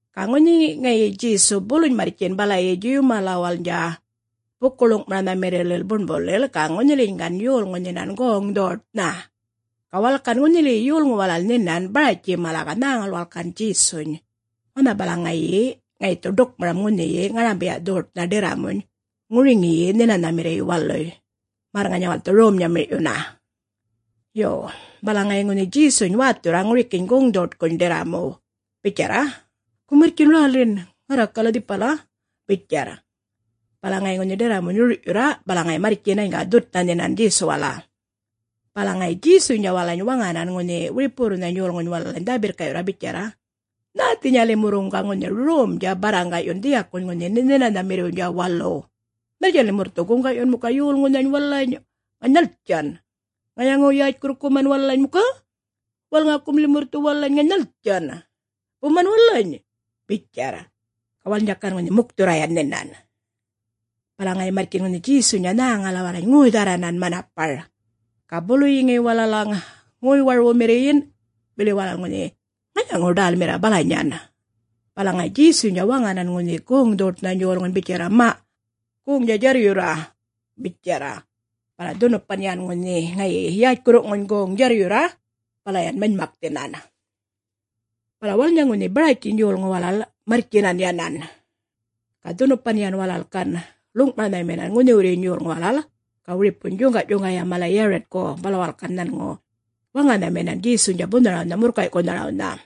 Ga ŋunhi ŋayi Djesu buluny marrtjin balayi Djuw malawalnydja buku-ḻuŋ'maranhamirrilil buṉbulil, ga ŋunhiliyiny gan yolŋun nhinan goŋ-dhoṯnha. Ga walal gan ŋunhiliyi yolŋu walal nhinan Baratji mala, ga nhäŋal walal gan Djesuny, wanha balaŋ ŋayi dhu ḏukmaram ŋunhiyi ŋarambiya'-dhoṯnha ḏirramuny ŋuriŋiyi Nhinanhamirriy waluy, märr ŋanya walal dhu rom-nyamir'yunna. Yo, bala ŋayi ŋunhi Djesuny wäthurra ŋurikiyiny goŋ'-dhoṯkuny bitjarra, “Go marrtji räli ŋarrakal dhipal,” bitjarr. Bala ŋayi ŋunhi ḏirramuny rur'yurra, bala ŋayi marrtjinany ga dhutnha nhinan Djesuwala. Bala ŋayi Djesuynydja walalany waŋanan ŋunhi wiripuwurrunhany yolŋuny walalany dhä-birrka'yurra bitjarra, “Nhäthinya limurruŋ ŋunhi romdja ga barraŋga'yun dhiyakuny ŋunhi Nhinanhamirriwnydja waluw? Nhaltjan limurr dhu guŋga'yun muka yolŋunhany walalany? … ŋany nhaltjan? … ŋayaŋu-yätjkurrkuman walalany muka? … Walŋakum limurr dhu walalany? … ŋany nhaltjan? … buman walalany?” bitjarr. Ga walalnydja gan ŋunhi mukthurra yan nhinan. Bala ŋayi marrtjin ŋunhi Djesuynydja nhäŋala walalany, ŋoy-dhärranan manapar, ga buluyi ŋayi walalaŋ ŋayaŋu-warwumirriyin, bili walal ŋunhi ŋayaŋu-ḏälmirra balanyan. Bala ŋayi Djesuynydja waŋanan ŋunhi goŋ-dhoṯnhany yolŋuny bitjarr, “Ma', goŋdja djarryurra,” bitjarr. Bala dhunupan yan ŋayi ŋunhi yätjkurruŋuny goŋ djarryurra, bala yan manymakthinan. Bala walalnydja ŋunhi Baratjiny yolŋu mala marrtjinan yanan. Ga dhunupan yan bala walal ḻuŋ'maranhaminan, ŋunhiwurryiny yolŋu walal, ga wiripuny djuŋga'-djuŋgaya mala Yaritku. Bala walal gan nhanŋu waŋanhaminan Djesuwnydja bunharawnha murrkay'kunharawnha.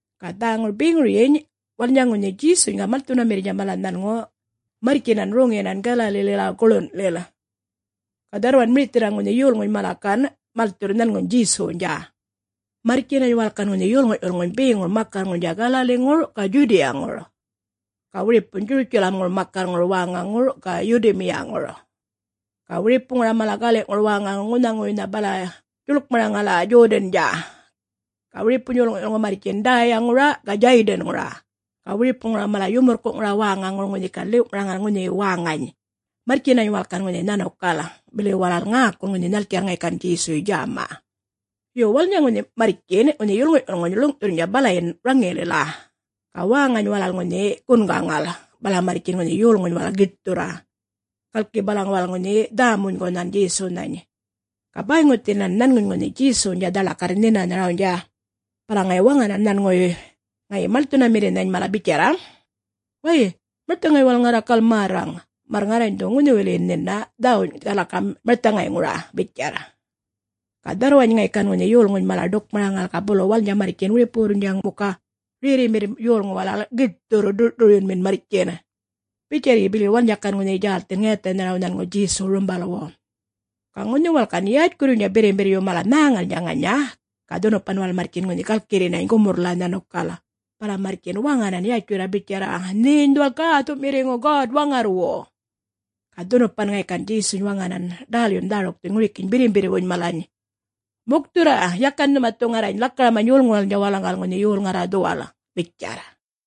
Ga dhäŋur beŋuryiny walalnydja ŋunhi Djesuny ga malthunamirrnydja mala nhanŋu marrtjinan roŋiyinan Galalilila guḻun'lil, ga dharrwan mirithirra ŋunhi yolŋuny mala gan malthurr nhanŋuny Djesuwnydja. Marrtjinany walal gan ŋunhi yolŋu'-yulŋuny beŋur makarrŋurnydja Galaliŋur ga Djudiyaŋur, ga wiripuny Djurutjalamŋur makarrŋur wäŋaŋur, ga Yidumiyaŋur, ga wiripuŋura mala gali'ŋur wäŋaŋur ŋunhaŋuwuynha bala djuḻkmaraŋala Djodandja. Ga wiripuny yolŋu'-yulŋu marrtjin Däyaŋura ga Djäydanŋura, ga wiripuŋuŋura mala yumurrku'ŋura wäŋaŋur ŋunhi gan ḻiw'maraŋal ŋunhiyi wäŋany, marrtjinany walal gan ŋunhi nhanukal, bili walal ŋäkul ŋunhi nhaltjarr ŋayi gan Djesuy djäma. Yo, walalnydja marrtjin ŋunhi yolŋu'-yulŋuny ḻuŋ'thurrnydja balayin raŋilila, ga wäŋany walal ŋunhi gungaŋal, bala marrtjin ŋunhi yolŋuny walal giṯthurra, galki walal balaŋ ŋunhi dhä-monygunhan Djesunhany, ga bäyŋuthinan nhanŋuny ŋunhi Djesuwnydja dhaḻakarr nhinanharawnydja. Bala ŋayi waŋanan nhanŋuwuy ŋayi malthunamirrinhany mala bitjarra, “Way, marthaŋay walal ŋarrakal märraŋ, märr ŋarrany dhu ga ŋunhiliyin nhina dhäwuny lakaram marthaŋayŋura,” bitjarr. Ga dharrwany ŋayi gan ŋunhi yolŋunhany mala ḏukmaraŋal, ga bulu walalnydja marrtjin wiripuwurrnydja muka rerrimirr yolŋu walal giṯthurr ḏur'-ḏuryunminan marrtjin, bitjarryi bili walalnydja gan ŋunhi djälthin ŋayathanharaw nhanŋu Djesuw rumbalwu. Ga ŋunhi walal gan yätjkurruynydja birrimbirryu mala nhäŋalnydja ŋanya, ga dhunupan walal marrtjin ŋunhi galkirrinany gumurrlila nhanukal, bala marrtjin waŋanan yatjurra bitjarra, “Nheny dhuwal Gäthu'mirriŋu God-Waŋarrwu.” Ga dhunupan ŋayi gan Djesuny waŋan ḏälyun dhärukthuny ŋurikiyiny birrimbirrwuny mala, “Mukthurra. Yakan nhuma dhu ŋarrany lakaramany yolŋuwalnydja walalaŋgal ŋunhi yol ŋarra dhuwal,” bitjarra.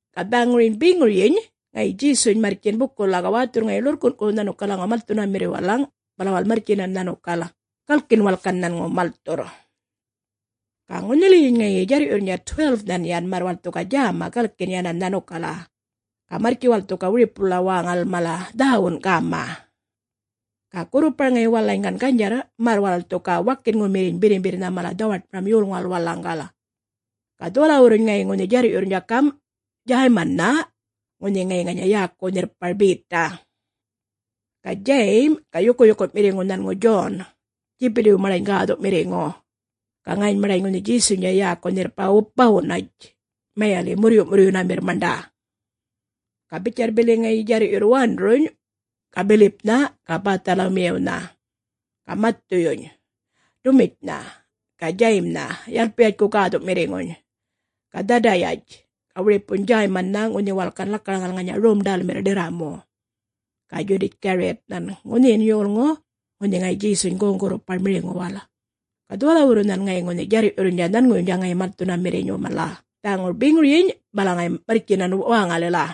Ga dhäŋur beŋuryiny ŋayi Djesu marrtjin bukulila, ga wäthurr ŋayi ḻurrkun'ku yan malthunamirriw walalaŋ, bala walal marrtjinan nhanukal galkin walal gan nhanŋu malthurr. Ga ŋunhiliyiny ŋayi djarr'yurrnydja 12-nhan yan, märr walal dhu ga djäma galkin yanan nhanukala, ga marrtji walal dhu ga wiripulila wäŋalil mala dhäwun gäma. Ga gurrupar ŋayi walalany gan ganydjarr märr walal dhu ga wakinŋumirriny birrimbirrnha mala dhawaṯmaram yolŋuwal walalaŋgal. Ga dhuwalawurruny ŋayi ŋunhi djarr'yurrnydja gam', Djäymannha, ŋunhi ŋayi ŋanya yäku nhirrpar Beta, ga Djayim, ga yukuyuku'mirriŋu nhanŋu Djon, Djipitiw maṉḏany gäthu'mirriŋu, ga ŋayiny maṉḏany ŋunhi Djesuynydja yäku nhirrpar Bawunatj, mayali' “Murryu'murryunamirr maṉḏa.” Ga bitjarryi bili ŋayi djarr'yurr Wanduruny, ga Bilipnha, ga Bäthalamiyawnha, ga Mathuyuny, Dumitjnha, ga Djayimnha Yalpayatjku gäthu'mirriŋuny, ga Dhadayatj, ga wiripuny Djäymannha ŋunhi walal gan lakaraŋal ŋanya rom-ḏälmirr ḏirramu, ga Djudatj-Gariyatnhan, ŋunhiyin yolŋu ŋunhi ŋayi Djesuny goŋ-gurrupar miriŋuwala. Ga dhuwalawurrunhan ŋayi ŋunhi djarr'yurrnydja nhanŋuwuynydja ŋayi malthunamirriny mala. Dhäŋur beŋuryiny, bala ŋayi marrtjinan wäŋalila.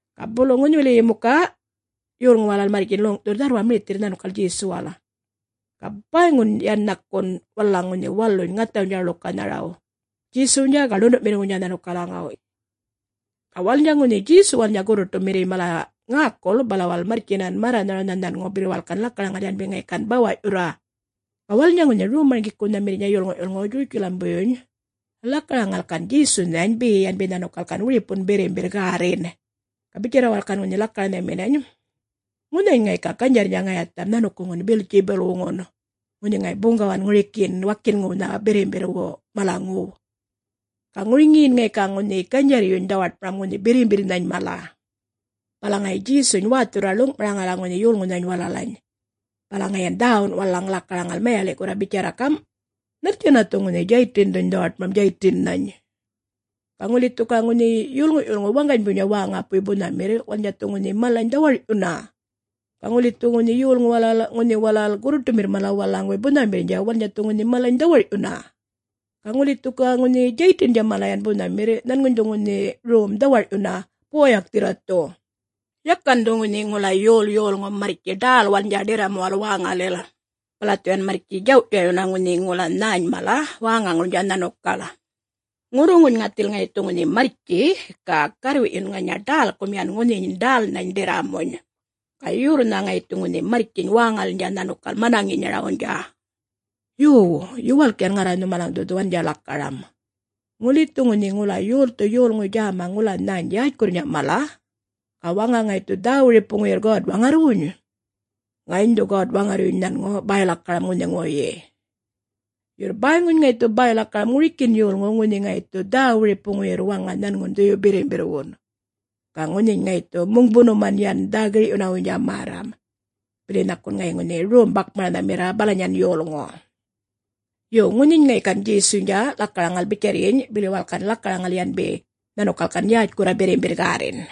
Ga bulu ŋunhiwiliyiny muka yolŋu walal marrtjin ḻuŋ'thurr dharrwan mirithirra nhanukal Djesuwal, ga bäyŋun yan nhakun walalaŋ ŋunhi waluny ŋathawnydja ḻukanharaw, Djesuwnydja ga ḻundu'mirriŋuwnydja nhanukalaŋaw. Ga walalnydja ŋunhi Djesuwalnydja gurruṯumirriy mala ŋäkul, bala walal marrtjinan märranharawnha nhanŋu, bili walal gan lakaraŋal yanbi ŋayi gan bawa'yurra. Ga walalnydja ŋunhi Rom-marŋgikunhamirriynydja yolŋu'-yulŋuy Djurutjalambuyyuny lakaraŋal gan Djesunhany be yanbi nhanukal gan wiripun birrimbirr gärrin. Ga bitjarra walal gan ŋunhi lakaranhaminany, “Ŋunhany ŋayi ga ganydjarrnydja ŋayatham nhanukuŋun Beltjibulwuŋun, ŋunhi ŋayi buŋgawan ŋurikiyin ŋunhi wakinŋuwnha birrimbirrwu malaŋuw, ga ŋuriŋiyin ŋayi ga ŋunhi ganydjarryuny dhawaṯmaram ŋunhi birrimbirrnhany mala.” Bala ŋayi Djesuny wäthurra ḻuŋ'maraŋala ŋunhi yolŋunhany walalany, bala ŋayi yan dhäwun walalaŋ lakaraŋal mayali'kurra bitjarra gam', “Nhaltjanna dhu ŋunhi Djaytindhuny dhawaṯmaram Djaytinnhany? Ga ŋuli dhu ga ŋunhi yolŋu'-yulŋu waŋganybuynydja wäŋapuy bunhamirr, walalnydja dhu ŋunhi malany dhawar'yunna. Ga ŋuli dhu ga yolŋu walal ŋunhi walal gurruṯumirr mala walalaŋguwuy bunhamirrnydja, walalnydja dhu ŋunhi malany dhawar'yunna. Ga ŋuli dhu ga ŋunhi Djaytindja mala yan bunhamirr, nhanŋuny dhu ŋunhi rom dhawar'yunna yan buwayakthirra dhu.” “Yakan dhu ŋunhi ŋula yol yolŋu marrtji ḏälwalnydja ḏirramuwal wäŋalil, bala dhu yan marrtji djaw'-djaw'yunna ŋunhi ŋula nhäny mala wäŋaŋurnydja nhanukal. Ŋurruŋuny ŋathil ŋayi dhu ŋunhi marrtji ga garrwi'yun ŋanya ḏälkum yan ŋunhiyiny ḏälnhany ḏirramuny, ga yorrnha ŋayi dhu marrtjiny wäŋalilnydja nhanukal manaŋinyarawnydja.” “Yo, yuwalk yan ŋarra nhumalaŋ dhu dhuwandja lakaram. Ŋuli dhu ŋunhi ŋula yolthu yolŋuy djäma ŋula nhäny yätjkurrnydja mala, ga waŋa ŋayi dhu ga dhä-wiripuŋuyirr God-Waŋarrwuny, ga ŋayiny dhu ŋunhi God-Waŋarryuny nhanŋu bäy-lakaram ŋunhiŋuwuyyi. Yurr bäyŋuny ŋayi dhu bäy-lakaram ŋurikin yolŋuw ŋunhi ŋayi dhu ga dhä-wiripuŋuyirr waŋa nhanŋun Dhuyu-Birrimbirrwun, ga ŋunhiny ŋayi dhu muŋbunuman yan dhä-gir'yunawuynydja märram, bili nhakun ŋayi ŋunhi rom-bakmaranhamirra balanyan yolŋu.” Yo, ŋunhiny ŋayi gan Djesuynydja lakaraŋal bitjarryiny, bili walal gan lakaraŋal yanbi nhanukal gan yätjkurra birrimbirr gärrin.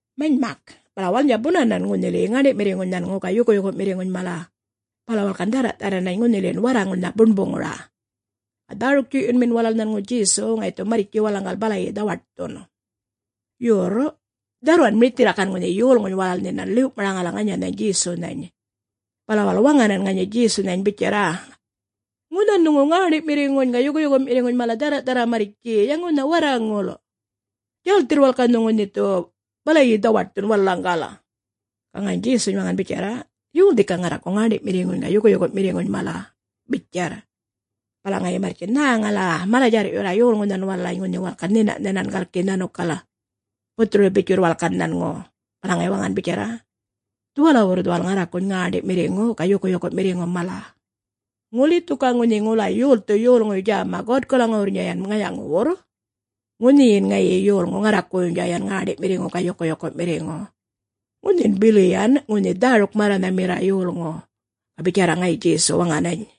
Manymak, bala walalnydja bunanan ŋunhiliyi ŋäṉḏi'mirriŋuny nhanŋu ga yukuyuku'mirriŋuny mala, bala walal gan dhärra'-dharranany ŋunhilin warraŋulnha buṉbuŋura, ga dhäruk-djuy'yunmin walal nhanŋu Djesuw ŋayi dhu marrtji walalaŋgal balayi dhawaṯthun. Yurr dharrwan mirithirra gan ŋunhi yolŋuny walal nhinan ḻiw'maraŋala ŋanyanhany Djesunhany, bala walal waŋanan ŋanya Djesunhany bitjarra, “Ŋunhan nhuŋu ŋäṉḏi'mirriŋuny ga yukuyuku'mirriŋuny mala dhärra'-dharra marrtji ya ŋunha warraŋul, djälthirr walal ga nhuŋu nhe dhu bala dhawaṯthun walalaŋgal.” Ga ŋayiny Djesuny waŋan bitjarra, “Yol dhika ŋarraku ŋäṉḏi'mirriŋuny ga yukuyuku'mirriŋu mala?” bitjarr. Bala ŋayi marrtjin nhäŋala mala-djarr'yurra yolŋunhan walalany, ŋunhi walal gan nhina'-nhinan galki nhanukal, buthuru-bitjurr walal gan nhanŋu, bala ŋayi waŋan bitjarra, “Dhuwalawurr dhuwal ŋarrakuny ŋäṉḏi'mirriŋu ga yukuyuku'mirriŋu mala. Ŋuli dhu ga ŋunhi ŋula yolthu yolŋuy djäma Godkalaŋuwurrnydja yan ŋayaŋuwurr, ŋunhiyin ŋayi yolŋu ŋarrakuwuynydja yan ŋäṉḏi'mirriŋu ga yukuyuku'mirriŋu, ŋunhin bili yan ŋunhi dhäruk-märranhamirra yolŋu,” ga bitjarra ŋayi Djesu waŋanany.